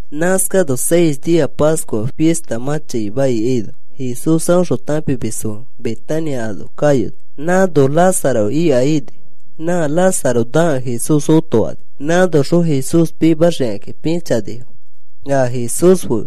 Nãskano seis nia Pascua fista mã chaima ikaino Jesús aõxõ tãpimisfo fe Betania ano kayoni. Nãno Lázaro ika ini. Nã Lázaro nakẽ Jesús otofani. Nãnoxõ Jesús pimaxikakĩ pĩchanifo, a Jesús fe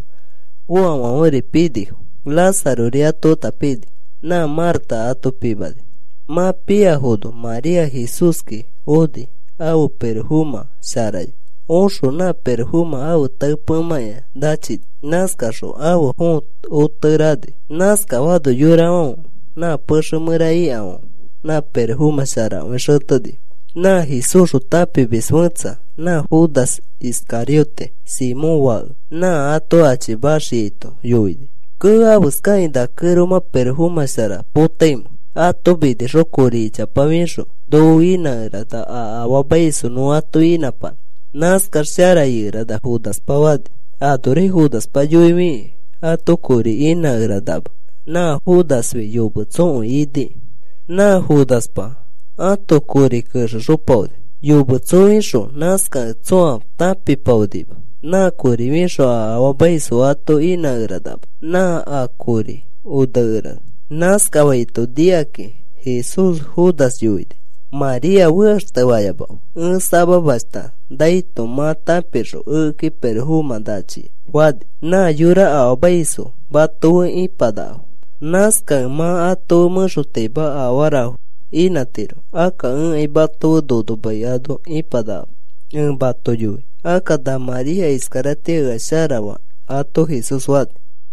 foafãferi pinifo. Lázarori ato feta pini. Nã Marta ato pimani. Mã piafono María Jesúski oni ãfe pirofomã sharaya. Oxõ nã pirofomã ãfe tae pemãkĩa nachini. Nãskaxõ ãfe fõo otekere ani. Nãskafaano yorafãfe nã pexe mẽra ikafãfe nã pirofomã sharakõi xetenifo. Nã Jesúsxõ tãpimis fẽtsa nã Judas Iscariote, Simón fake, nã ato achimaxiaito yoini, “Kee. ¿Afeskakĩ na kẽromã pirofomã shara potaimẽ? Ato minixõ kori ichapa fixõ noko inãkerana a afaamaisfo nõ ato inãpanã. Nãskax shara ikerana,” Judaspa fani. Anori Judaspa yoifikĩ ato kori inãkeranama. Nã Judasfi yometsokõi iniki. Nã Judaspa ãto kori kexexopaoni. Yometsofixõ nãskakẽ tsõa tãpipaonima. Nã kori fixõ a afaamaisfo ato inãkeranama, nã a kori onekerana. Nãskafaito nikakĩ Jesús Judas yoini: “María fekaxtefayamafe. Ẽ samamashta naito mã tãpixõ ekeki pirofomã nachia,” fani. “Nã yora afaamaisfo mato fe ipanakafo. Nãskakẽ mã ato mẽxotaima afarafo inãtiro. Akka ẽkai mato fe nono mai ano ipanakama, ẽ mato yoi. Akka na María iskaratĩa ea shara faa,” ato Jesús fani.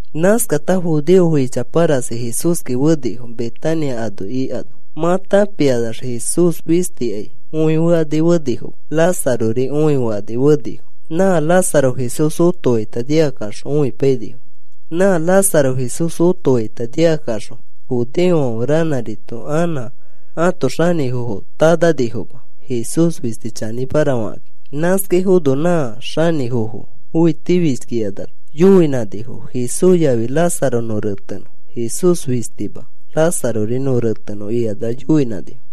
Nãskata judeofo ichapa rasi Jesúski fenifo, Betania ano ikano mã tãpikanax Jesús fistikai õifekani fenifoma. Lázarori õifekani fenifo. Nã Lázaro Jesús otofaita nikakaxõ õipainifo. Nã Lázaro Jesús otofaita nikakaxõ judeofãfe ranãrito anã ãto xanĩfofo tananifoma Jesús fisti chanĩmara fakakĩ. Nãskaifono nã xanĩfofo õitifishkikanax yoinãnifo: “Jesús yafi Lázaro nõ retenõ. Jesús fistima. Lázarori nõ retenõ,” ikanax yoinãnifo.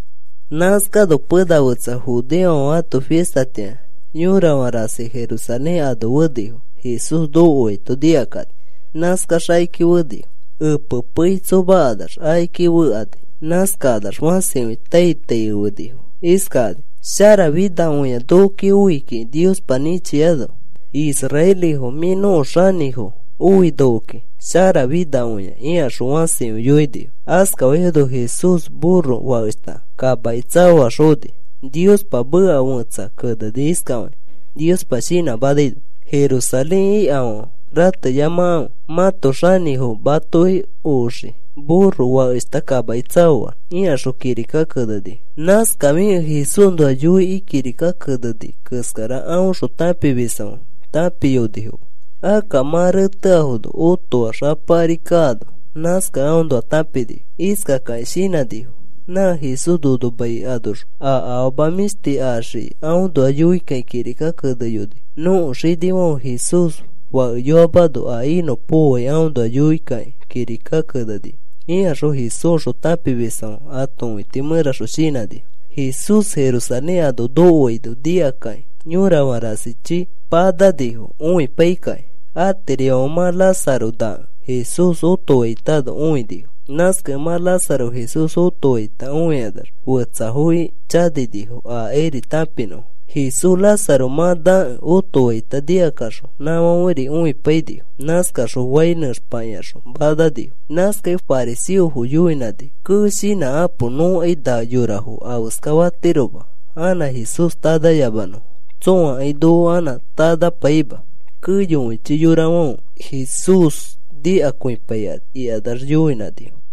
Nãskano pena fetsa judeofãfe ãto fistatĩa yorafã rasi Jerusalén ano fenifo. Jesús nokoaito nikakani nãskax akiki fenifo. Epe pei tsomakanax akiki fekani. Nãskakanax fãsikõi tai tai ifenifo iskakani: “¡Sharafinakõi nokoki oi kiki Niospa nĩchiano! Israelifo mĩ nõko xanĩfo oi nokoki. ¡Sharafinakõia!” ikaxõ fãsikõi yoinifo. Askafaifono Jesús burro fakeshta kamaki tsaoax oni. Niospa meka fẽtsa keneni iskafakĩ Niospa shinãmanaino: Jerusalén ikafãfe, rateyamakãfe. Mãto xanĩfo matoki oxii burro fakeshta kamaki tsaoax, ikaxõ kirika keneni. Nãskafikẽ Jesúsnoa yoikĩ kirika keneni keskara aõxõ tãpimisfãfe tãpiyonifoma. Akka mã reteafono otoax Apa ari kaano nãskakẽ aõnoa tãpinifo. Iskakakĩ shinãnifo: “Nã Jesús nono mai anoxõ a afama mĩshti axiai aõnoa yoikakĩ kirika keneyoni. Nõko xinifãfe Jesús fakeyoamano a inõpokoai aõnoa yoikakĩ kirika keneni,” ikaxõ Jesúsxõ tãpimisfãfe ãto õiti mẽraxõ shinãnifo. Jesús Jerusalén ano nokoaino nikakakĩ yorafã rasichi a mananifo õipakakĩ. Atirifãfe mã Lázaro nakẽ Jesús otofaitano õinifo. Nãskakẽ mã Lázaro Jesús otofaita õikanax fetsafoki chaninifo akairi tãpinõfo. Jesús Lázaro mã nakẽ otofaita nikakaxõ nãfãferi õipainifo. Nãskaxõ fai nẽxpakĩaxõ mananifo. Nãskakẽ fariseofo yoinãnifo: “Kee. Shinãkapo. Nõkai na yorafo afeska fatiroma anã Jesús tanayamanõfo. Tsõakai noko anã tanapaima keyokõichi yorafãfe Jesús nikakõipaikani,” ikanax yoinãnifo.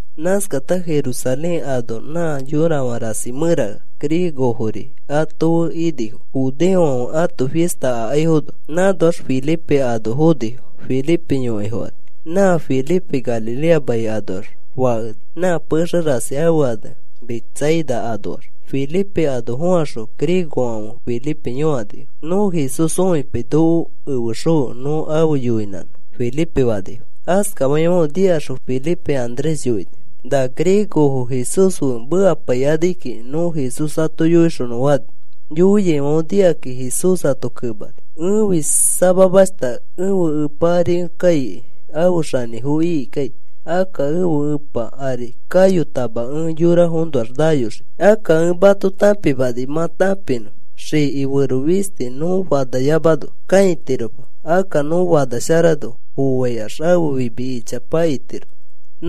Nãskata Jerusalén ano nã yorafã rasi mẽra griegofori ato fe inifo judeofãfe ãto fista akaifono. Nãnoax Felipe ano fonifo, Felipe yõkai fokani. Nã Felipe Galilea mai anoax fakeni, nã pexe rasi ãfe ane Betsaida anoax. Felipe ano fokaxõ griegofãfe Felipe yõkanifo: “Nõ Jesús õipai noko efexõfe nõ afe yoinãnõ,” Felipe fanifo. Askafaifãfe nikaxõ Felipe Andrés yoini: “Na griegofo Jesús fe mekapaikanikiki. Nõ Jesús ato yoixonõ,” fani. Yoiaifãfe nikakĩ Jesús ato kemani: “Ẽfi samamashta ẽfe Epa ari ẽ kaikai afe xanĩfo ikikai. Akka ẽfe Epa ari kayotama ẽ yorafonoax nayoxii. Akka ẽ mato tãpimani mã tãpinõ. Xiki fero fisti nõ fanayamano kãitiroma. Akka nõ fanasharano foaikax ãfe fimi ichapa itiro.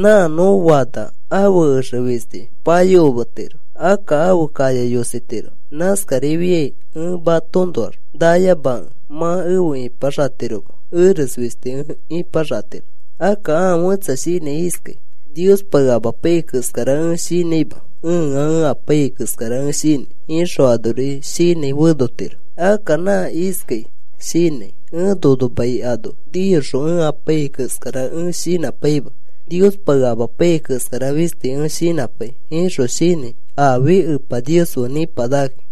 Nã nõ fana ãfe exe fisti payokometiro, akka ãfe kaya yositiro. Nãskarifiai ẽ matoõnoax nayamakẽ mã efe ipaxatiroma. Eres fisti ẽ ipaxatiro. Akka ãa fẽtsa shinãi iskai: ‘Niospa ea amapaiyai keskara ẽ shinãima, ẽa ẽ apaiyai keskara ẽ shinãi,’ ixõ anori shinãi fenotiro. Akka nã iskakĩ shinãi: ‘Ẽ nono mai ano niyoxõ ẽ apaiyai keskara ẽ shinãpaima, Niospa ea amapaiyai keskara fisti ẽ shinãpai,’ ixõ shinãi afi Epa Nios fe nipanakaki.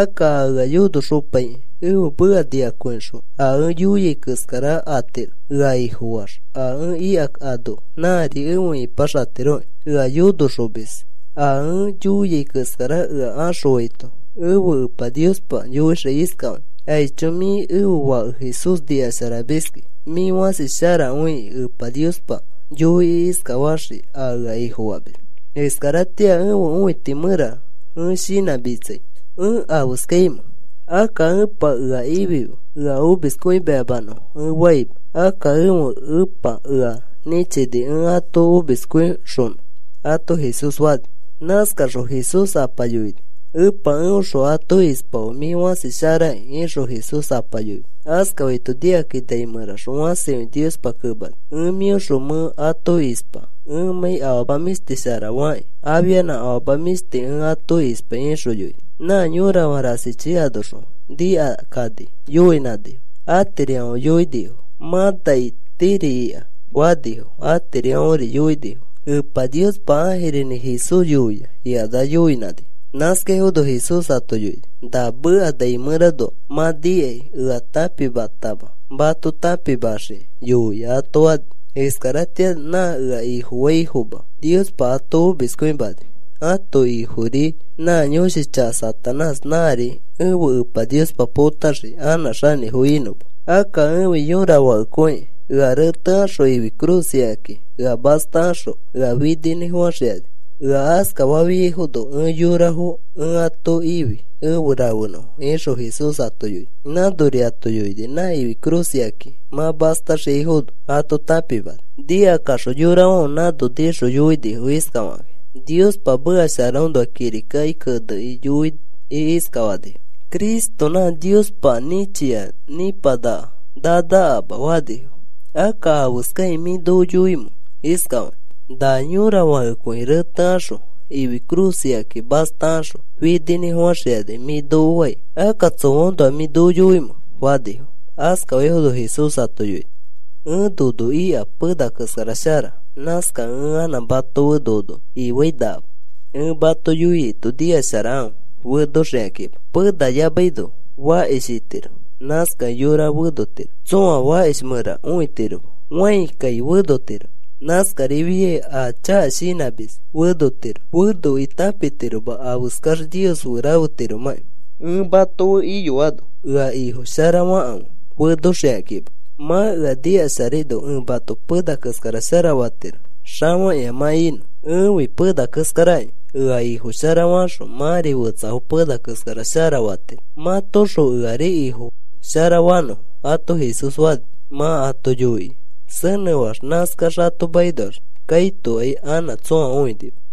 Akka a ea yonoxopaikĩ ẽfe meka nikakõixõ a ẽ yoiai keskara atiro. Ea Ifofax a ẽ ika ano nãri efe ipaxatiroki. Ea yonoxomis a ẽ yoiai keskara ea axõaito ẽfe Epa Niospa yoixii iskafakĩ: ‘Aicho. Mĩ ẽfe Fake Jesús nikasharamiski. Mĩ fãsi sharakõiki,’ Epa Niospa yoikĩ iskafaxii a ea Ifofamis. “Iskaratĩa ẽfe õiti mẽra ẽ shinãmitsai. ¿Ẽ afeskaimẽ? Akka, ‘Epa, ea ifife ea omiskõimayamanõfo,’ ẽ faima. Akka ẽfe Ẽpa ea nĩchini ẽ ato omiskõixonõ,” ato Jesús fani. Nãskaxõ Jesús Apa yoini: “Epa, eõxõ ato ispafe mĩ fãsi sharaki,” ixõ Jesús Apa yoini. Askafaito nikakĩ nai mẽraxõ fãsikõi Niospa kemani: “Ẽ mĩõxõ mẽ ato ispa ẽmãi afama mĩshti shara fakĩ afianã afama mĩshti ẽ ato ispai,” ixõ yoini. Nã yorafã rasichi anoxõ nikakani yoinãnifo. Atirifãfe yoinifo: “Mã nai tiri ika,” fanifo. Atirifãfe yoinifo: “Epa Niospa ãjirinĩ Jesús yoia,” ikanax yoinãnifo. Nãskaifono Jesús ato yoini: “Na meka nai mẽranoa mã nikai ea tãpimatama, mato tãpimaxikĩ yoia,” ato fani. “Iskaratĩa nã ea Ifofaifoma Niospa ato omiskõimani. Ãto ifori nã yõshi chaka Satanás nãri ẽfe Epa Niospa potaxii anã xanĩfo inõma. Akka ẽfi yõra fakekõi. Ea retekaxõ ifi cruz ikakĩ ea mastakaxõ ea fininĩfofãxikani. Ea askafaifono ẽ yorafo ẽ ato ifi efe rafenõfo,” ixõ Jesús ato yoini. Nãnori ato yoini nã ifi cruz ikakĩ mã mastaxiaifono ato tãpimani. Nikakaxõ yorafãfe nãno nixõ yoinifo iskafakakĩ: “Niospa meka sharaõnoa kirikaki kenekĩ yoikĩ iskafanifo: ‘Cristo, nã Niospa nĩchia nĩpanaka nanakama,’ fanifo. Akka, ¿afeskakĩ mĩ noko yoimẽ iskafakĩ?: ‘Na yõra fakekõi retekaxõ ifi cruz ikakĩ mastakaxõ fininĩfofãxikani,’ mĩ noko fai. ¿Akka tsoaõnoa mĩ noko yoimẽ?” fanifo. Askafaifono Jesús ato yoini: “Ẽ nono ika pena keskara shara. Nãskakẽ ẽ anã mato fe nono ifãinakama. Ẽ mato yoiaito nikasharakãfe fenoxikakima. Pena yamaino fakish itiro. Nãskakẽ yora fenotiro. Tsõa fakish mẽra õitiroma, fãi kai fenotiro. Nãskarifiai a chaka shinãmis fenotiro. Fenokĩ tãpitiroma afeskax Nios fe rafetiromãki. Ẽ mato fe iyoano ea Ifo shara fakãfe fenoxikakima. Mã ea nikasharaino ẽ mato pena keskara shara fatiro, xafakĩa mã inõ. Ẽfi pena keskarakĩ. Ea Ifo shara fakaxõ mãri fetsafo pena keskara shara fatiro mãtoxõ eari Ifo sharafanõfo,” ato Jesús fani. Mã ato yoikĩ senẽfax, nãskax ato makinoax kaitokai anã tsõa õinima.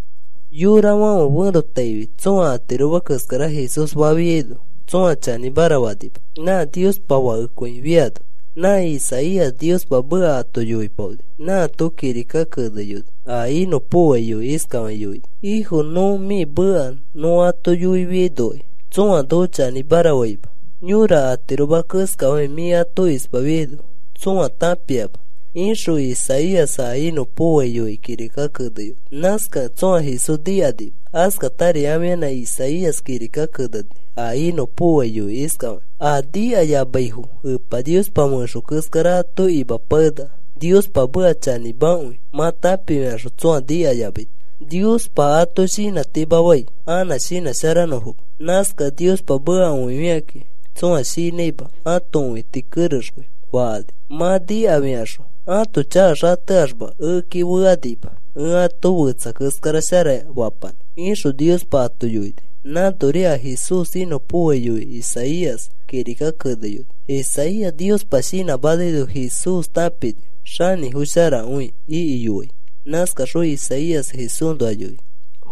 Yorafãfe ferotaifi tsõa atiroma keskara Jesús fafiaino tsõa chanĩmara fanima nã Niospa Fakekõi fiano. Nã Isaías Niospa meka ato yoipaoni. Nãato kirika keneyoni a inõpokoai yoikĩ. Iskafakĩ yoini: Ifo, nõ mĩ meka nõ ato yoifiainokai tsõa noko chanĩmara faima. Yõra atiroma keskafakĩ mĩ ato ispafiaino tsõa tãpiama, ixõ Isaías a inõpokoai yoikĩ kirika keneyoni. Nãskakẽ tsõa Jesús nikanima. Askatari afianã Isaías kirika keneni a inõpokoai yoikĩ iskafakĩ: A nikaiyamaifo Epa Niospa fẽxo keskara ato imapakenaka Niospa meka chanĩmakõi mã tãpifikaxõ tsõa nikayamaito. Niospa ato shinãtimafai anã shinãsharanõfoma. Nãskakẽ Niospa meka õifikakĩ tsõa shinãima ãto õiti kerexkõi fakani mã nikafikaxõ. Ãto chaka xateaxma ekeki fekanima ẽ ato fetsa keskara shara fapanã, ixõ Niospa ato yoini. Nãnori a Jesús inõpokoai yoikĩ Isaías kirika keneyoni. Isaías Niospa shinãmanaino Jesús tãpini xanĩfo sharakõi ikiyoai. Nãskaxõ Isaías Jesúsnoa yoini.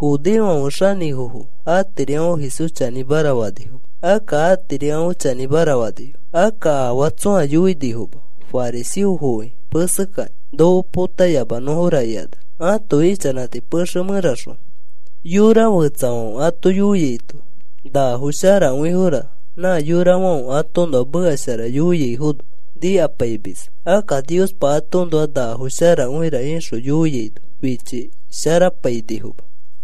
Judeofãfe xanĩfofo atirifãfe Jesús chanĩmara fanifoma. Akka atirifãfe chanĩmara fanifo. Akka afaa tsõa yoinifoma fariseofoki mesekakĩ noko potayamanõra ikanax ãto ichanãti pexe mẽraxõ. Yora fetsafãfe ato yoiaito nafo sharakõifora nã yorafãfe atoõnoa meka shara yoiaifono nikapaimisfo. Akka Niospa atoõnoa nafo sharakõira ixõ yoiaino fichisharapainifoma.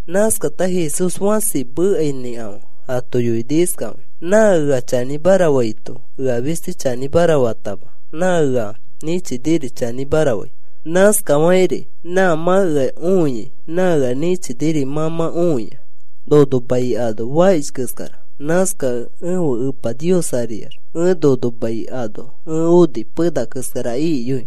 Nãskata Jesús fãsikõi mekainĩkafã ato yoini iskafakĩ: “Nã ea chanĩmara faito ea fisti chanĩmara fatama nã ea nĩchiniri chanĩmara fai. Nãskafakĩri mã mã ea õia nã ea nĩchiniri mã mã õia. Nono mai ano fakish keskara. Nãskakẽ ẽfe Epa Nios ariax ẽ nono mai ano ẽ oni pena keskara ikiyoi.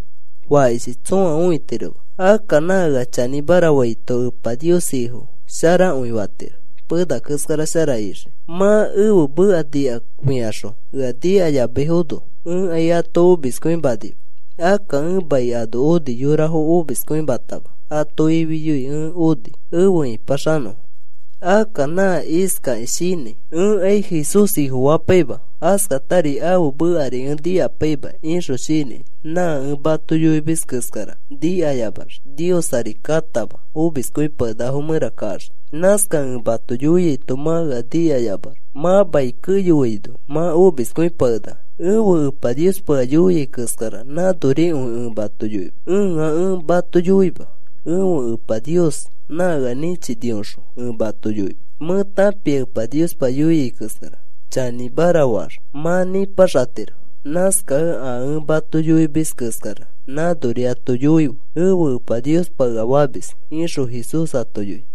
Fakishi tsõa õitiroma. Akka nã ea chanĩmara faito Epa Nios Ifo sharakõifatiro pena keskara shara ixiki. “Mã ẽfe meka nikafikaxõ ea nikayamaifono ẽkai ato omiskõimanima. Akka ẽ mai ano oni yorafo omiskõimatama ato ifiyoi ẽ oni efe ĩpaxanõfo. Akka nã iskakĩ shinãi: ‘Ẽkai Jesús Ifofapaima, askatari ãfe mekari ẽ nikapaima,’ ixõ shinãi nã ẽ mato yoimis keskara nikayamax Nios ari katama omiskõipakenakafo mẽra kaxii. Nãskakẽ ẽ mato yoiaito mã ea nikayamax mã mai keyoaino mã omiskõipakenaka. Ẽfe Epa Niospa ea yoia keskara nãnorikõi ẽ mato yoimis. Ẽa ẽ mato yoima. Ẽfe Epa Nios nã ea nĩchinioxõ ẽ mato yoimis. Mẽ tãpia Epa Niospa yoia keskara chanĩmara faax mã nĩpaxatiro. Nãskakẽ, ‘A ẽ ato yoimis keskara nãnori ato yoife,’ Ẽfe Epa Niospa ea famis,” ixõ Jesús ato yoini.